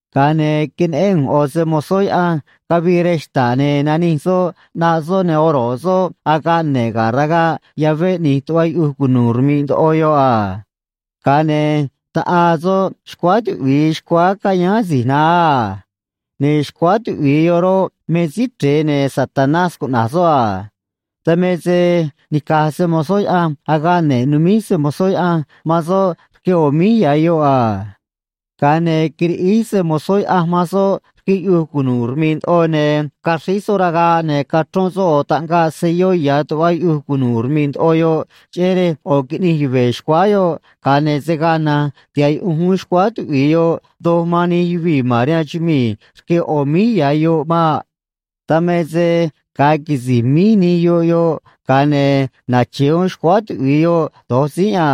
Ga̱a ne̱ queneꞌén ꞌu̱nj ꞌo̱ se‑mo̱zó Yaꞌanj cavii rej xta̱ꞌ, ne̱ nanij soꞌ ꞌnaꞌ soꞌ, ne̱ oro̱ꞌ soꞌ agaꞌ ne̱ꞌ ga̱ ragaꞌ yavé ꞌni̱j tuꞌva yuꞌuj cunu̱u̱ rmi̱ꞌ ndoꞌo yoꞌ a. Ga̱a ne̱ taꞌaa soꞌ xcuáá tuꞌvi̱i xcuáá cayáán asi̱j naá a. Ne̱ xcuáá tuꞌvi̱i yoꞌ roꞌ, me Síí Chre̱e, ne̱ Satanás cuꞌna̱j soꞌ a. Dan me se nica̱j se‑mo̱zó Yaꞌanj agaꞌ ne̱ꞌ numíj se‑mo̱zó Yaꞌanj man soꞌ rque ꞌo̱ míj ya̱ yoꞌ a. Ga̱a ne̱ quiriꞌíj se‑mo̱zó Yaꞌanj man soꞌ rque yuꞌuj cunu̱u̱ rmi̱ꞌ ndoꞌo, ne̱ caxríj soꞌ ragaꞌ, ne̱ cachrón soꞌ ꞌo̱ taꞌngaꞌ selló ya̱ tuꞌva yuꞌuj cunu̱u̱ rmi̱ꞌ ndoꞌo yoꞌ, cheꞌé rej ꞌo̱ qui̱ꞌnij yuve̱ xcuáá yoꞌ, ga̱a ne̱ se̱ gaa na̱nj tiha̱ꞌ yuꞌunj uún xcuáá tuꞌvi̱i yoꞌ doj man nij yuvii̱ ma̱n rihaan chumii̱ rque ꞌo̱ míj ya̱ yoꞌ maꞌ. Dan me se ga̱a quisi̱j míj nij yoꞌ yoꞌ, ga̱a ne̱ nache̱ uún xcuáá tuꞌvi̱i yoꞌ do̱j tzínꞌ a.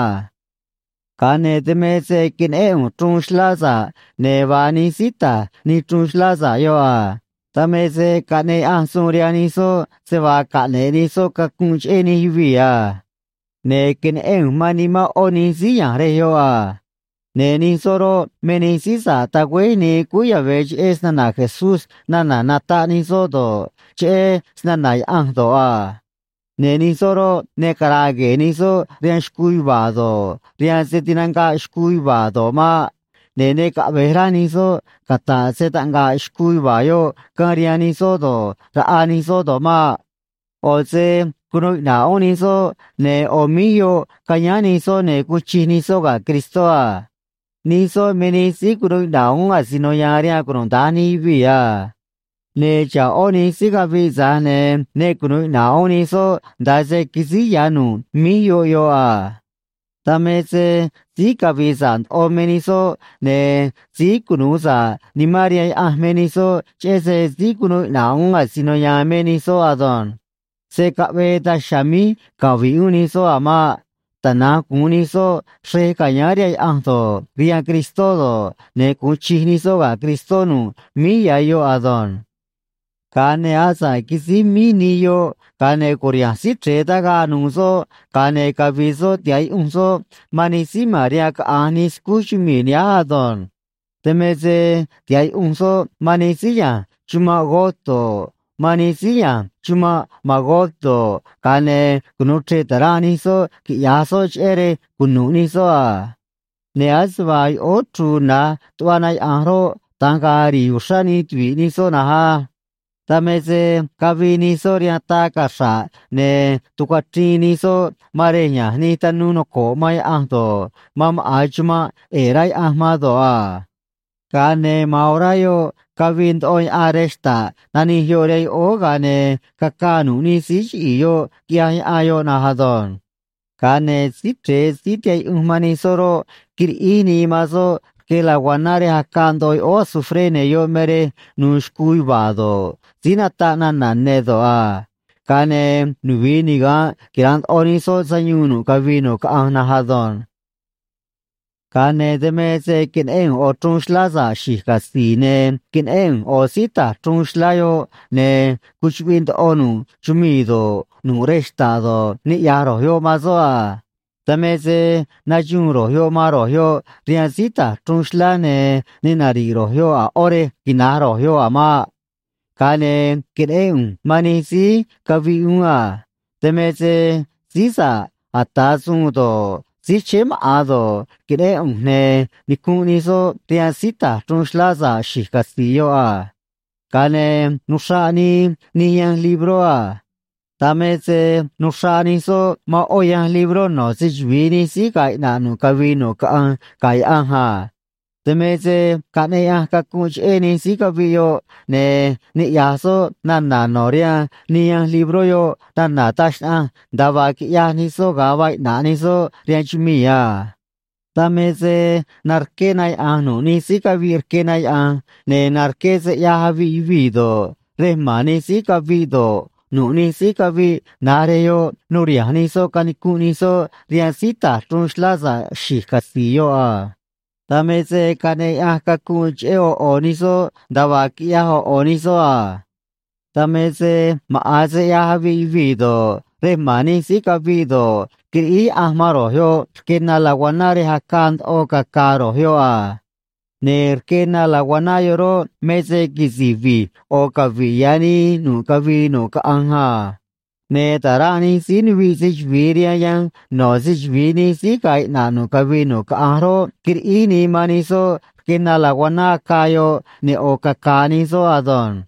Ga̱a ne̱ dan me se queneꞌén ꞌu̱nj chruun xlá sa̱ꞌ, ne̱ vaa nij síí ta̱j nij chruun xlá sa̱ꞌ yoꞌ a. Dan me se caꞌneꞌ Yaꞌanj suun rihaan nij soꞌ se vaa caꞌne̱ꞌ nij soꞌ cacunꞌ cheꞌé nij yuvii̱ a. Ne̱ queneꞌén ꞌu̱nj man nimán ꞌó nij síí ya̱nj rej yoꞌ a. Ne̱ nij soꞌ roꞌ, me nij síí sa̱ꞌ tagüéj nii cúú yave̱ cheꞌé snana̱ Jesús nana̱ nataꞌ nij soꞌ do̱ꞌ, cheꞌé snana̱ Yaꞌanj do̱ꞌ a. Ne̱ nij soꞌ roꞌ, ne cara̱a̱ gue̱e̱ nij soꞌ rihaan xcuu yuva̱a̱ do̱ꞌ, rihaan se tinanga̱ꞌ xcuu yuva̱a̱ do̱ꞌ maꞌ. Ne̱ ne caꞌve̱j rá nij soꞌ cata̱ꞌ se‑taꞌnga̱ꞌ xcuu yuva̱a̱ yoꞌ caan rihaan nij soꞌ do̱ꞌ, raꞌa nij soꞌ do̱ꞌ maꞌ. ꞌO̱ se cunuu iꞌna̱ꞌ uún nij soꞌ, ne̱ ꞌo̱ míj yoꞌ cayáán nij soꞌ ne̱ guun chij nij soꞌ ga̱ Cristó a. Nij soꞌ me nij síí cunuu iꞌna̱ꞌ uún asino ya̱a̱n rihaan cunuda̱nj nij yuvii̱ a. Ne̱ xa̱ꞌ ꞌó nij síí caviꞌ, tza̱j ne̱ ne cunu̱u iꞌna̱ꞌ uún nij soꞌ nda̱a se quisíj ya̱ nu̱ꞌ míj yoꞌ yoꞌ a. Dan me se síí cavi̱i̱ sa̱ꞌ ndoꞌo me nij soꞌ, ne̱ síí cunu̱u sa̱ꞌ nimán rihaan Yaꞌanj me nij soꞌ, cheꞌé se síí cunu̱u iꞌna̱ꞌ uún asino ya̱a̱n me nij soꞌ ado̱nj. Se̱ caꞌvee daj chiha̱a̱ míj cavi̱ꞌ uún nij soꞌ a̱ maꞌ. Tana̱nj gu̱un nij soꞌ xrej ca̱yáán rihaan Yaꞌanj do̱ꞌ, rihaan Cristó do̱ꞌ, ne̱ gu̱un chij nij soꞌ ga̱ Cristó nu̱ꞌ míj ya̱ yoꞌ ado̱nj. Ga̱a ne̱ asa̱ꞌ quisíj míj nij yoꞌ, ga̱a ne̱ cu̱riha̱nj Síí Chre̱e tagaꞌ nu̱u̱ soꞌ, ga̱a ne̱ cavi̱i̱ soꞌ tiha̱ꞌ yuꞌunj soꞌ man nij síí ma̱n rihaan caꞌa̱nj nij scúj chumii̱ nihánj ado̱nj. Dan me se tiha̱ꞌ yuꞌunj soꞌ man nij síí ya̱nj chumanꞌ Gog do̱ꞌ, man nij síí ya̱nj chumanꞌ Magog do̱ꞌ, ga̱a ne̱ cunu̱u chre̱ꞌ ta̱ranꞌ nij soꞌ, quiꞌya̱j soꞌ, cheꞌé rej cunu̱ꞌ nij soꞌ a. Ne̱ ase vaa yoꞌóó chru̱u̱ na̱j tuꞌva na yaꞌa̱nj roꞌ, da̱nj ga̱a̱ ri̱i̱ uxrá nij tuvi̱ꞌ nij soꞌ na̱nj á. Dan me se cavii nij soꞌ rihaan taa cachra̱ꞌ, ne̱ tucuachriin nij soꞌ man rej ya̱nj nij tanuu noco̱ꞌ man Yaꞌanj do̱ꞌ, man maꞌa̱n chumanꞌ ꞌe̱e̱ rá Yaꞌanj man do̱ꞌ a. Ga̱a ne̱ ma̱an orá yoꞌ cavii ndoꞌo yaꞌan rej xta̱ꞌ nanij yoꞌ rihaan yoꞌóó, ga̱a ne̱ cacaa nu̱ꞌ nij síí chiꞌi̱i̱ yoꞌ, quiꞌyaj yaꞌan yoꞌ na̱nj ado̱nj. Ga̱a ne̱ Síí Chre̱e síí tihaꞌ yuꞌunj man nij soꞌ roꞌ, quiriꞌíj nii man soꞌ rque laguaná rej acaa ndoꞌo yoꞌóó azufré, ne̱ yoꞌ me rej nu̱u̱ xcuu yuva̱a̱ do̱ꞌ, síí nataꞌ nana̱ ne̱ do̱ꞌ a. Ga̱a ne̱ nuvi̱i niga̱nꞌ quira̱nꞌ ndoꞌo nij soꞌ sayuun nu̱ꞌ cavii nu̱ꞌ caꞌanj na̱nj ado̱nj. Ga̱a ne̱ dan me se queneꞌén ꞌu̱nj ꞌo̱ chruun xlá sa̱ꞌ xi̱j catzi̱i̱, ne̱ queneꞌén ꞌu̱nj ꞌo̱ síí ta̱j chruun xlá yoꞌ, ne̱ cuchuꞌviꞌ ndoꞌo nu̱ꞌ chumii̱ do̱ꞌ, nu̱ꞌ rej xta̱ꞌ do̱ꞌ, niꞌya̱j ro̱j yoꞌ man soꞌ a. Dan me se naxuun ro̱j yoꞌ man ro̱j yoꞌ rihaan síí ta̱j chruun xlá, ne̱ ne nari̱ꞌ ro̱j yoꞌ a̱ ꞌó rej quina̱j ro̱j yoꞌ a̱ maꞌ. Ga̱a ne̱ queneꞌén ꞌu̱nj man nij síí caviꞌ uún a. Dan me se síí sa̱ꞌ ata̱ suun do̱ꞌ, síí chéé maꞌa̱n do̱ꞌ, queneꞌén ꞌu̱nj, ne̱ nicunꞌ nij soꞌ rihaan síí ta̱j chruun xlá sa̱ꞌ xi̱j catzi̱i̱ yoꞌ a. Ga̱a ne̱ nuxraꞌ nii nij yanj libró a. Dan me se nuxraꞌ nij soꞌ man ꞌó yanj libró no̱ se‑chuvi̱i nij síí ga̱a̱ iꞌna̱ꞌ nu̱ꞌ cavii nu̱ꞌ caꞌanj ga̱ Yaꞌanj a. Dan me se caꞌneꞌ Yaꞌanj cacunꞌ cheꞌé nij síí caviꞌ yoꞌ, ne̱ niꞌya̱j soꞌ nana̱ no̱ rihaan nij yanj libró yoꞌ nana̱ taj xnaꞌanj nda̱a vaa quiꞌyaj nij soꞌ ga̱a vaa iꞌna̱ꞌ nij soꞌ rihaan chumii̱ a. Dan me se narqué na yaꞌa̱nj nu̱ꞌ nij síí caviꞌ rque na yaꞌa̱nj, ne̱ narqué se ꞌyaj aviꞌ yuvii̱ do̱ꞌ, rej ma̱n nij síí caviꞌ do̱ꞌ, nu̱ꞌ nij síí caviꞌ na̱j rej yoꞌ nuriha̱nj nij soꞌ canicunꞌ nij soꞌ rihaan síí ta̱j chruun xlá sa̱ꞌ xi̱j catzi̱i̱ yoꞌ a. Dan me se caꞌneꞌ Yaꞌanj cacunꞌ cheꞌé ꞌo̱ ꞌo̱ nij soꞌ nda̱a vaa quiꞌyaj ꞌo̱ ꞌo̱ nij soꞌ a. Dan me se maꞌa̱n se ꞌyaj aviꞌ yuvii̱ do̱ꞌ, rej ma̱n nij síí caviꞌ do̱ꞌ, quiriꞌíj Yaꞌanj man ro̱j yoꞌ rque na laguaná rej acaa ndoꞌo caca̱a̱ ro̱j yoꞌ a. Ne̱ rque na laguaná yoꞌ roꞌ, me se quisi̱j vi̱j ꞌo̱ cavi̱ꞌ ya̱ nii nu̱ꞌ cavii nu̱ꞌ caꞌanj a. Ne̱ ta̱ranꞌ nij síí nuviꞌ se‑chuvi̱i rihaan yanj no̱ se‑chuvi̱i nij síí ga̱a̱ iꞌna̱ꞌ nu̱ꞌ cavii nu̱ꞌ caꞌanj roꞌ, quiriꞌíj nii man nij soꞌ rque na laguaná acaa yoꞌ, ne̱ ꞌo̱ caca̱a̱ nij soꞌ ado̱nj.